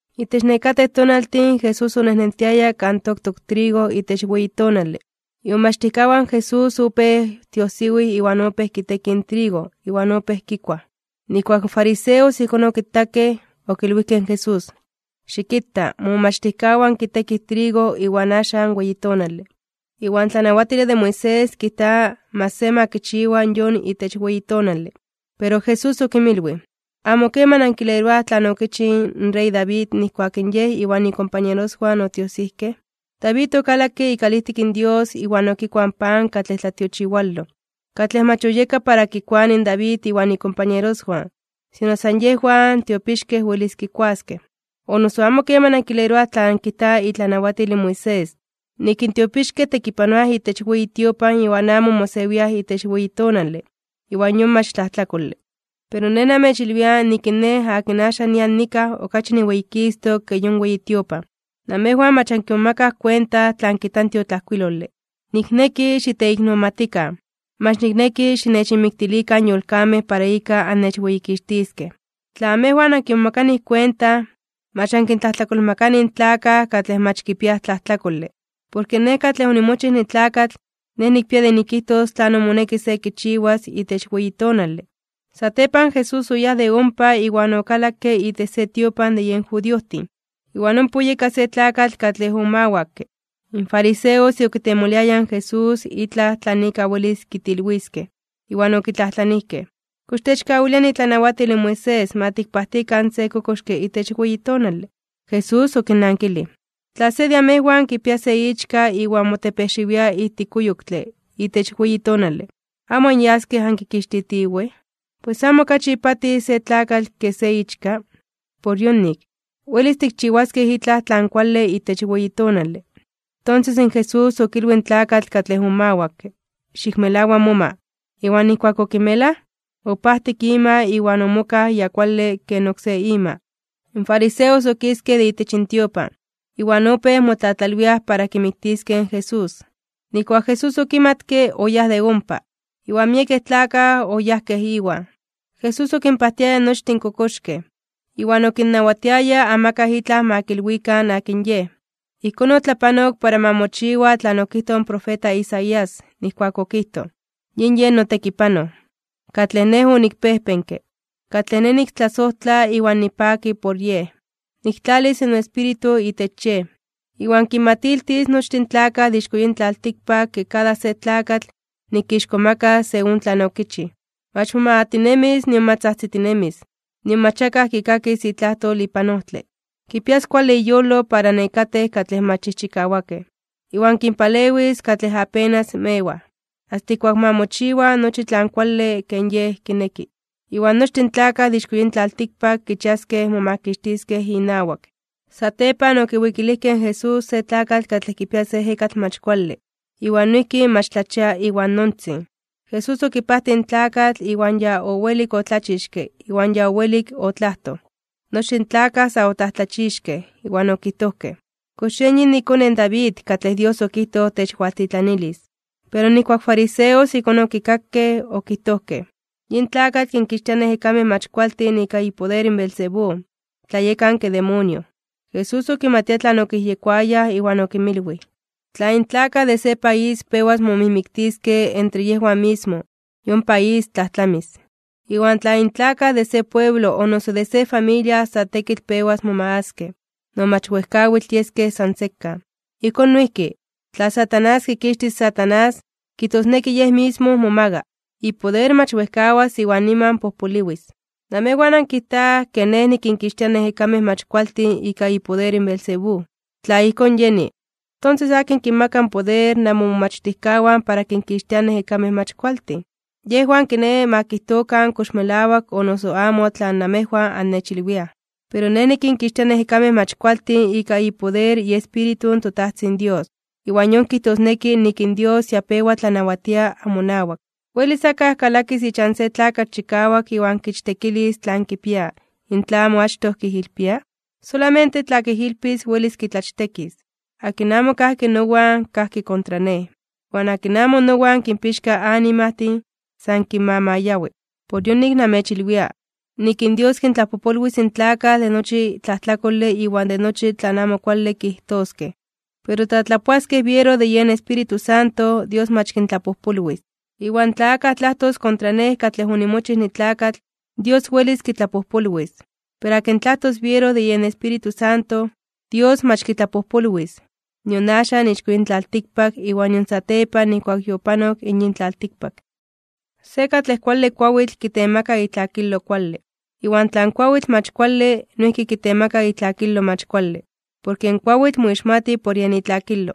Itech nekatej tonaltin Jesús onejnentiaya kan toktok trigo itech weyi tonale. Imomachtijkawan Jesús opéj tiojsiwij iwan opéj kitekij trigo iwan opéj kikuaj. Nijkuak in fariseos ijkón okitakej, okilwijkej in Jesús: ―Xikita, momomachtijkawan kitekij in trigo iwan axan weyi tonale, iwan tlanawatile de Moisés kijta mach se ma kichiwa yon itech weyi tonale. Pero Jesús okinmilwij: ―¿Amo keman ankileroaj tlan okichij in rey David nijkuak in yej iwan ikompañeroswan otiojsijkej? David okalakke ikalijtik in Dios iwan okikuaj in pan katlej tlatiochiwaloj, katlej mach oyeka para kikuanij in David iwan ikompañeroswan, sino san yejwan tiopixkej welis kikuaskej. ¿O noso amo keman ankileroaj tlan kijta itlanawatil in Moisés, nik in tiopixkej tekipanoaj itech weyi tiopan iwan amo mosewiaj itech weyi tonale, iwan yon mach tlajtlakole? Pero Nej namechilwia nik in Nej akin axan nian nikaj okachi niweyikistok (niweyititok) ke yon weyi tiopan. Namejwan mach ankimomakaj kuenta tlan kijta in tiotlajkuilole: “Nikneki xiteiknomatikan, mach nikneki xinechinmiktilikan yolkamej para ika annechweyikixtiskej.” Tla amejwan ankimomakanij kuenta, mach ankintlajtlakolmakanij in tlakaj katlej mach kipiaj tlajtlakole. Porke Nej katlej onimochij nitlakatl, Nej nikpia de nikijtos tlanon moneki se kichiwas itech weyi tonale. Satepan, Jesús oyáj de ompa iwan okalakke itech se tiopan de yen judiojtin. Iwan ompa oyeka se tlakatl katlej omawakke. In fariseos okitemoliayaj in Jesús itlaj tlan ika welis kitilwiskej, iwan okitlajtlanijkej: ―¿Kox techkawilia itlanawatil in Moisés ma tikpajtikan se kokoxke itech weyi tonale? Jesús okinnankilij: ―Tla se de amejwan kipia se ichka iwan motepejxiwia ijtik kuyoktle itech weyi tonale, ¿amo anyaskej ankikixtitiwej? Pues, ¿amo okachi ipatij se tlakatl ke se ichka? Por yonik, welis tikchiwaskej itlaj tlan kuale itech weyi tonale. Tonses in Jesús okilwij in tlakatl katlej omawakke: ―Xikmelawa moma. Iwan nijkuak okimelaj, opajtik ima iwan omokaj ya kuale ken oksé ima. In fariseos okiskej de itech intiopan, iwan opéj motlatlalwiaj para kimiktiskej in Jesús. Nijkuak Jesús okimatke, oyáj de ompa, iwan miekej tlakaj oyajkej Iwan. Jesús okinpajtiaya nochtin in kokoxkej. Iwan okinnawatiaya amakaj itlaj ma kilwikan akin Yej. Ijkón otlapanok para ma mochiwa tlan okijtoj in profeta Isaías, nijkuak okijtoj: Yin yej notekipanoj, katlej Nej onikpejpenke, katlej Nej niktlasojtla iwan nipaki por Yej. Niktlalis noEspíritu itech Yej, iwan kinmatiltis nochtin in tlakaj de ixko yin tlaltikpak ke kada se tlakatl nikixkomakas según tlan okichij. Mach momagatinemis, nion mach tzajtzitinemis, nion mach akaj kikakis itlajtol ipan ojtle. Kipias kuale iyolo para nekatej katlej mach chijchikawakej, iwan kinpalewis katlej yakin mewaj, asta ijkuak ma mochiwa nochi tlan kuale ken Yej kineki. Iwan nochtin in tlakaj de ixko yin tlaltikpak kichiaskej momakixtiskej inawak. Satepan okiwikilijkej in Jesús se tlakatl katlej kipia se ejekatl mach kuale, iwan noijki mach tlachia iwan nontzin. Jesús okipajtij in tlakatl iwan ya owelik otlachixke iwan ya owelik otlajtoj. Nochtin in tlakaj sa otlajtlachixkej (omomajmawtijkej), iwan okijtojkej: ―¿Kox yen yin ikone in David katlej Dios okijtoj techwaltitlanilis? Pero nijkuak in fariseos ijkón okikakej, okijtojkej: ―Yin tlakatl kinkixtia in ejekamej mach kualtin ika ipoder in Beelzebú, in tlayekanke demonio. Jesús okimatia tlan okiyejyekoayaj, iwan okinmilwij: ―Tla in tlakaj de se país pewas momijmiktiskej entre yejwan mismo, yon país tlajtlamis. Iwan tla in tlakaj de se pueblo o noso de se familia sa tekitl pewas momagaskej, no mach wejkawitl yeskej san sekan. Ijkón noijki, tla Satanás kikixtis in Satanás, kijtosneki yej mismo momaga. Ipoder mach wejkawas iwan niman pojpoliwis. Namejwan ankijtaj ke Nej nikinkixtia in ejekamej mach kualtin ika ipoder in Beelzebú. Tla ijkón yeni, ¿tonses akin kinmaka poder namomomachtijkawan para kinkixtiaj in ejekamej mach kualtin? Yejwan kiné ma kijtokan kox melawak o noso amo tlan namejwan annechilwiaj. Pero Nej nikinkixtia in ejekamej mach kualtin ika ipoder iEspíritu in toTajtzin Dios, iwan yon kijtosneki nik in Dios ya pewa tlanawatia amonawak. ’¿Welis akaj kalakis ichan se tlakatl katlej chikawak iwan kichtekilis tlan kipia, in tla amo achtoj kijilpia? Solamente tla kijilpis welis kitlachtekis. ’Akin amo kajki nowan, kajki kontra Nej. Iwan akin amo nowan kinpixka animajtin, san kinmamayawi. ’Por yonik namechilwia, nik in Dios kintlapojpolwis in tlakaj de nochi tlajtlakole iwan de nochi tlan amo kuale kijtoskej, pero tla tlapoaskej biero de yen Espíritu Santo, Dios mach kintlapojpolwis. Iwan tla akaj tlajtos kontra Nej katlej onimochij nitlakatl, Dios welis kitlapojpolwis, pero akin tlajtos biero de yen Espíritu Santo, Dios mach kitlapojpolwis, nion axan ixko yin tlaltikpak iwan nion satepan nijkuak yopanok in yin tlaltikpak. ’Se katlej kuale kuawitl, kitemaka itlakilo kuale. Iwan tla in kuawitl mach kuale, noijki kitemaka itlakilo mach kuale. Porke in kuawitl moixmati por yen itlakilo.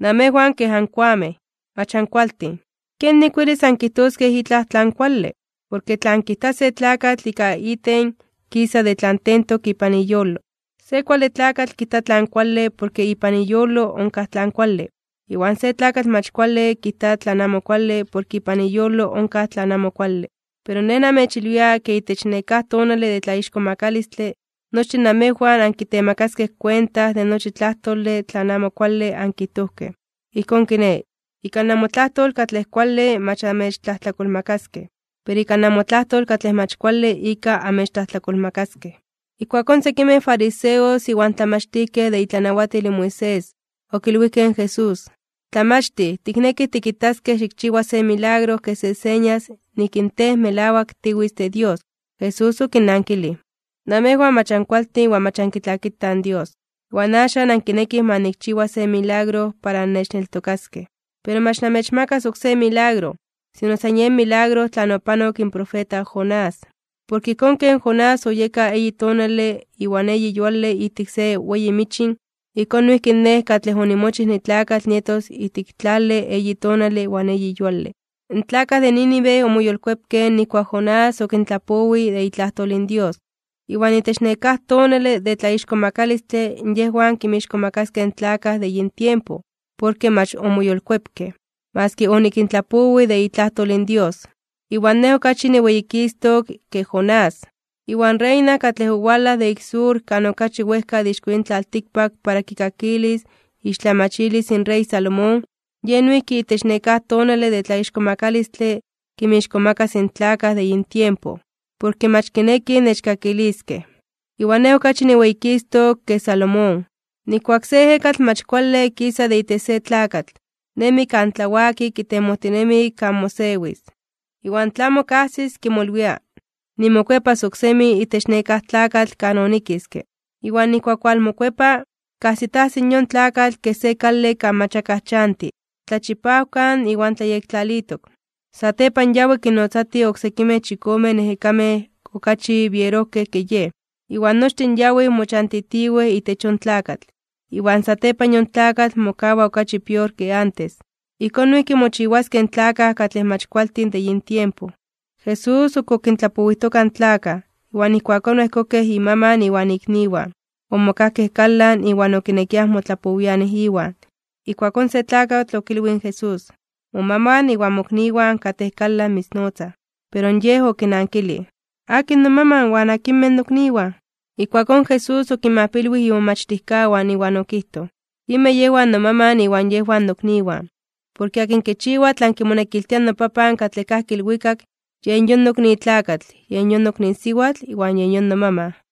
¡Namejwan kej ankoamej! Mach ankualtin, ¿kenik welis ankijtoskej itlaj tlan kuale? Porke tlan kijta se tlakatl ika iten kisa de tlan tentok ipan iyolo. Se kuale tlakatl kijta tlan kuale porke ipan iyolo onkaj tlan kuale, iwan se tlakatl mach kuale kijta tlan amo kuale porke ipan iyolo onkaj tlan amo kuale. Pero Nej namechilwia ke itech nekáj tonale de tlaixkomakalistle (tlatzonmanalos), nochtin namejwan ankitemakaskej kuenta de nochi tlajtole tlan amo kuale katlej ankijtojkej. Ijkón kiné, ika namotlajtol katlej kuale mach amechtlajtlakolmakaskej, pero ika namotlajtol katlej mach kuale ika amechtlajtlakolmakaskej. Ijkuakón sekimej fariseos iwan tlamachtijkej de itlanawatil in Moisés, okilwijkej in Jesús: ―Tlamachtij, tiknekij tikitaskej xikchiwa se milagro kej se señas nik in Tej melawak tiwitz de Dios. Jesús okinnankilij: ―Namejwan mach ankualtin iwan mach ankitlakitaj in Dios. Iwan axan ankinekij ma nikchiwa se milagro para annechneltokaskej. Pero mach namechmakas oksé milagro, sino san yen milagro tlan opanok in profeta Jonás. Porke ijkón ken Jonás oyeka eyi tonale iwan eyi yuale ijtik se weyi michin, ijkón noijki in Nej katlej onimochij nitlakatl nietos ijtik tlale eyi tonale iwan eyi yuale. In tlakaj de Nínive omoyolkuepkej nijkuak in Jonás okintlapowij de itlajtol in Dios. Iwan itech nekáj tonale de tlaixkomakalistle (tlatzonmanalos) yejwan kinmixkomakaskej in tlakaj de yin tiempo, porke mach omoyolkuepkej, maski onikintlapowij de itlajtol in Dios, iwan Nej okachi niweyikistok (niweyititok) ke Jonás. Iwan in reina katlej owalaj de ik tlani kan okachi wejka de ixko yin tlaltikpak para kikakilis iixtlamachilis in rey Salomón, yej noijki itech nekáj tonale de tlaixkomakalistle (tlatzonmanalos) kinmixkomakas in tlakaj de yin tiempo, porke mach kinekij nechkakiliskej, iwan Nej okachi niweyikistok (niweyititok) ke Salomón. ’Nijkuak se ejekatl mach kuale kisa de itech se tlakatl, nemi kan tlawaki kitemojtinemi kan mosewis. Iwan tla amo kajsis, kimolwia: “Nimokuepas oksemi itech nekáj tlakatl kan onikiske.” Iwan nijkuak walmokuepa, kajsitajsi in yon tlakatl kej se kale kan mach akaj chanti, tlachipawkan iwan tlayektlalitok. Satepan yawi kinnotzatij oksekimej chikomen ejekamej okachi bierojkej ke yej, iwan nochtin yawij mochantitiwej itech yon tlakatl, iwan satepan yon tlakatl mokawa okachi pior ke antes. Ijkón noijki mochiwaskej in tlakaj katlej mach kualtin de yin tiempo. Jesús ok okintlapowijtoka in tlakaj, iwan ijkuakón oejkokej imaman iwan ikniwan. Omokajkej kalan, iwan okinekiaj motlapowianij Iwan. Ijkuakón se tlakatl okilwij in Jesús: ―Momaman iwan mokniwan katej kalan mitznotzaj. Pero Yej okinankilij: ―¿Akin nomaman, iwan akinmej nokniwan? Ijkuakón Jesús okinmajpilwij imomachtijkawan, iwan okijtoj: ―Yinmej yejwan nomaman iwan yejwan nokniwan. Porke akin kichiwa tlan kimonekiltia noPapan katlej kajki ilwikak, yen yon nokni tlakatl, yen yon nokni siwatl, iwan yen yon nomaman.